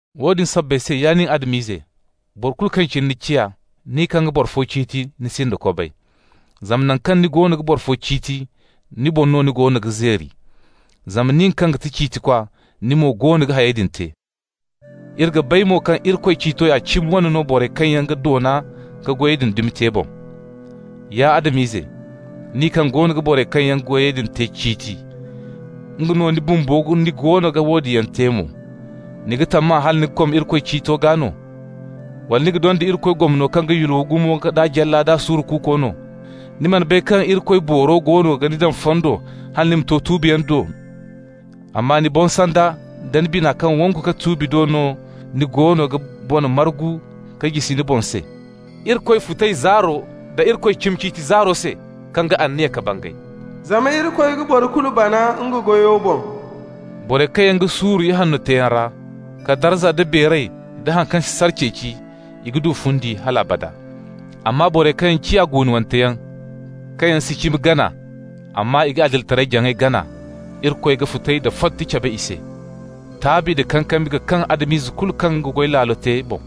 Woodin sabbay se ya nin Adam-ize, boro kulu kaŋ cine ni ciya, nin kaŋ ga boro fo ciiti, ni sinda kobay. Zama naŋ kaŋ ni goono ga boro fo ciiti, ni boŋ no ni goono ga zeeri, zama nin, kaŋ ga ti ciitikwa, ni mo goono ga hayey din te. Iri ga bay mo kaŋ Irikoy ciito ya cimi wane no borey kaŋ yaŋ doona ka goyey din dumi te boŋ. Ya Adam-ize, ni kaŋ goono ga borey kaŋ yaŋ ga goyey din te ciiti, nga no ni bumbo ni goono ga woodin yaŋ te mo, ni ga tammahã hala ni ga kooma Irikoy ciito gaa no? Wala ni ga donda Irikoy gomno kaŋ ga yulwa gumo, d'a jalla, d'a suuru kuuko no? Ni mana bay kaŋ Irikoy booro goono ga ni daŋ fondo no hala ni ma to tuubiyaŋ do? Amma ni boŋ sanda da ni bina kaŋ wangu ka tuubi do no ni goono ga bone margu ka jisi ni boŋ se, Irikoy futay zaaro da Irikoy cimi ciiti zaaro se, kaŋ ga aniya ka bangay. «Zama Irikoy ga boro kulu bana nga goyo boŋ.» Borey kaŋ yaŋ ga suuru ihanno teeyaŋ ra, ka darza nda beeray da haŋ kaŋ si sara ceeci, i ga du fundi hal abada. Amma borey kaŋ ciya guunuwanteyaŋ, kaŋ yaŋ si cimi gana, amma i ga adilitaray-jaŋay gana, Irikoy ga futay da fotti cabe i se. Taabi nda kankami ga kaŋ Adam-ize kulu kaŋ ga goy laalo te boŋ,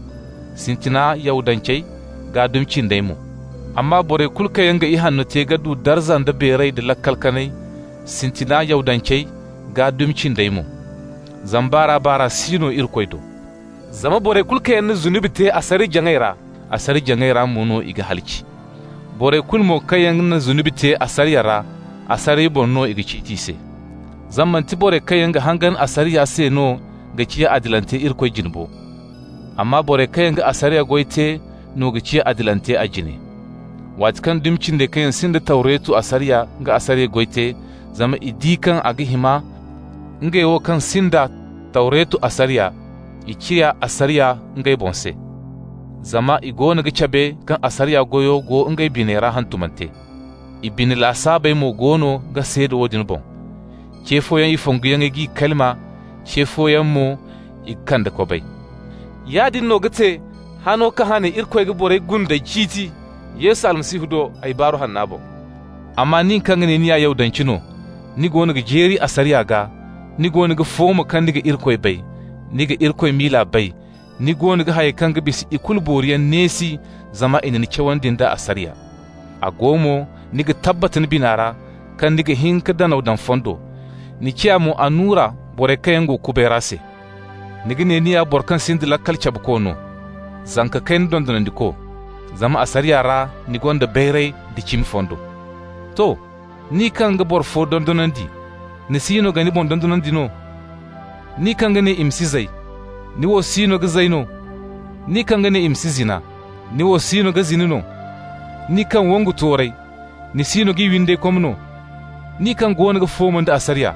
sintina Yahudancey, gaa dumi cindey mo. Amma borey kulu kaŋ yaŋ ga ihanno te ga du darza nda beeray da laakal kanay, sintina Yahudancey, gaa dumi cindey mo. Zama baar'a-baar'a si no Irikoy do. Zama borey kulu kaŋ yaŋ na zunubi te asariya-jaŋay ra, asariya-jaŋay ra mo no i ga halaci. Borey kulu mo kaŋ yaŋ na zunubi te asariya ra, asariya boŋ no i ga ciiti i se. Zama manti borey kaŋ yaŋ ga hangan asariya se no ga ciya adilante Irikoy jine bo, amma borey kaŋ yaŋ ga asariya goy te no ga ciya adilante a jine. (Waati kaŋ dumi cindey, kaŋ yaŋ sinda Tawretu asariya ga asariya goy te zama i di kaŋ a ga hima, ngey wo kaŋ sinda Tawretu asariya, i ciya asariya ngey boŋ se. Zama i goono ga cabe kaŋ asariya goyo go ngey biney ra hantumante. I bine lasaabey mo goono ga seeda woodin boŋ -- ce fooyaŋ i fonguyaŋey g'i kalima, ce fooyaŋ mo i ga kande kobay.) Yaadin no ga te hano kaŋ hane Irikoy ga borey gundey ciiti Yesu Almasihu do ay Baaru Hanna boŋ. Amma nin kaŋ ga ne ni ya Yahudance no, ni goono ga jeeri asariya gaa, ni goono ga fooma kaŋ ni ga Irikoy bay, ni ga Irikoy miila bay, ni goono ga hayey kaŋ ga bisa ikulu booriyaŋ neesi, zama i na ni cawandi nda asariya. A go mo, ni ga tabbat ni bina ra kaŋ ni ga hin ka danaw daŋ fondo, ni ciya mo annura borey kaŋ yaŋ go kubay ra se. Ni ga ne ni ya boro kaŋ sinda laakal cabeko no, zanka kayna dondonandiko, zama asariya ra ni gonda bayray da cimi fondo. To! Ni kaŋ ga boro fo dondonandi, ni siino ga ni boŋ dondonandi no? Ni kaŋ ga ne i ma si zay, ni wo siino ga zay no? Ni kaŋ ga ne i ma si zina, ni wo siino ga zina no? Ni kaŋ wangu toorey, ni siino g'i windey kom no? Ni kaŋ goono ga fooma nda asariya,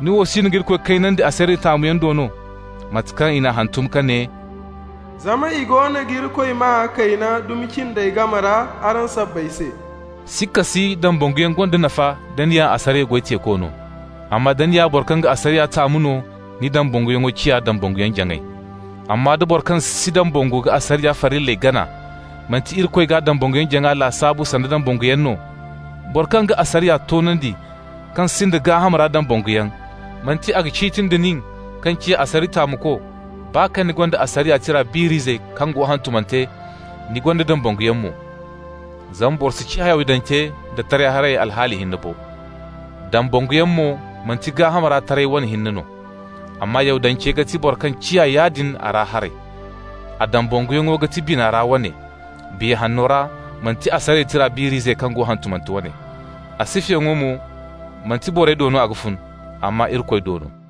ni wo siino ga Irikoy kaynandi asariya taamuyaŋ do no? Mate kaŋ i n'a hantum ka ne: «Zama i goono ga Irikoy maa kayna dumi cindey game ra araŋ sabbay se.» Sikka si dambanguyaŋ gonda nafa da ni ya asariya goy teeko no. Amma da ni ya boro kaŋ ga asariya taamu no, ni dambanguyaŋo ciya dambanguyaŋ-jaŋay. Amma da boro kaŋ si dambangu ga asariya farilley gana, manti Irikoy g'a dambanguyaŋ-jaŋa lasaabu sanda dambanguyaŋ no? Bora kaŋ ga asariya toonandi, kaŋ sinda gaaham ra dambanguyaŋ, manti a ga ciiti da nin, ni kaŋ ciya asariya taamuko, baa kaŋ ni gonda asariya tira biir'izey kaŋ go hantumante, ni gonda dambanguyaŋ mo. Zama boro si ciya Yahudance da taray alhaali hinne bo. Dambanguyaŋ mo, manti gaaham ra taray wane hinne no. Amma Yahudance ga ti boro kaŋ ciya yaadin a ra haray. A dambanguyaŋo ga ti bina ra wane, Biya Hanno ra, manti asariya tira biir'izey kaŋ go hantumante wane. A sifayaŋo mo, manti borey do no a ga fun, amma Irikoy do no.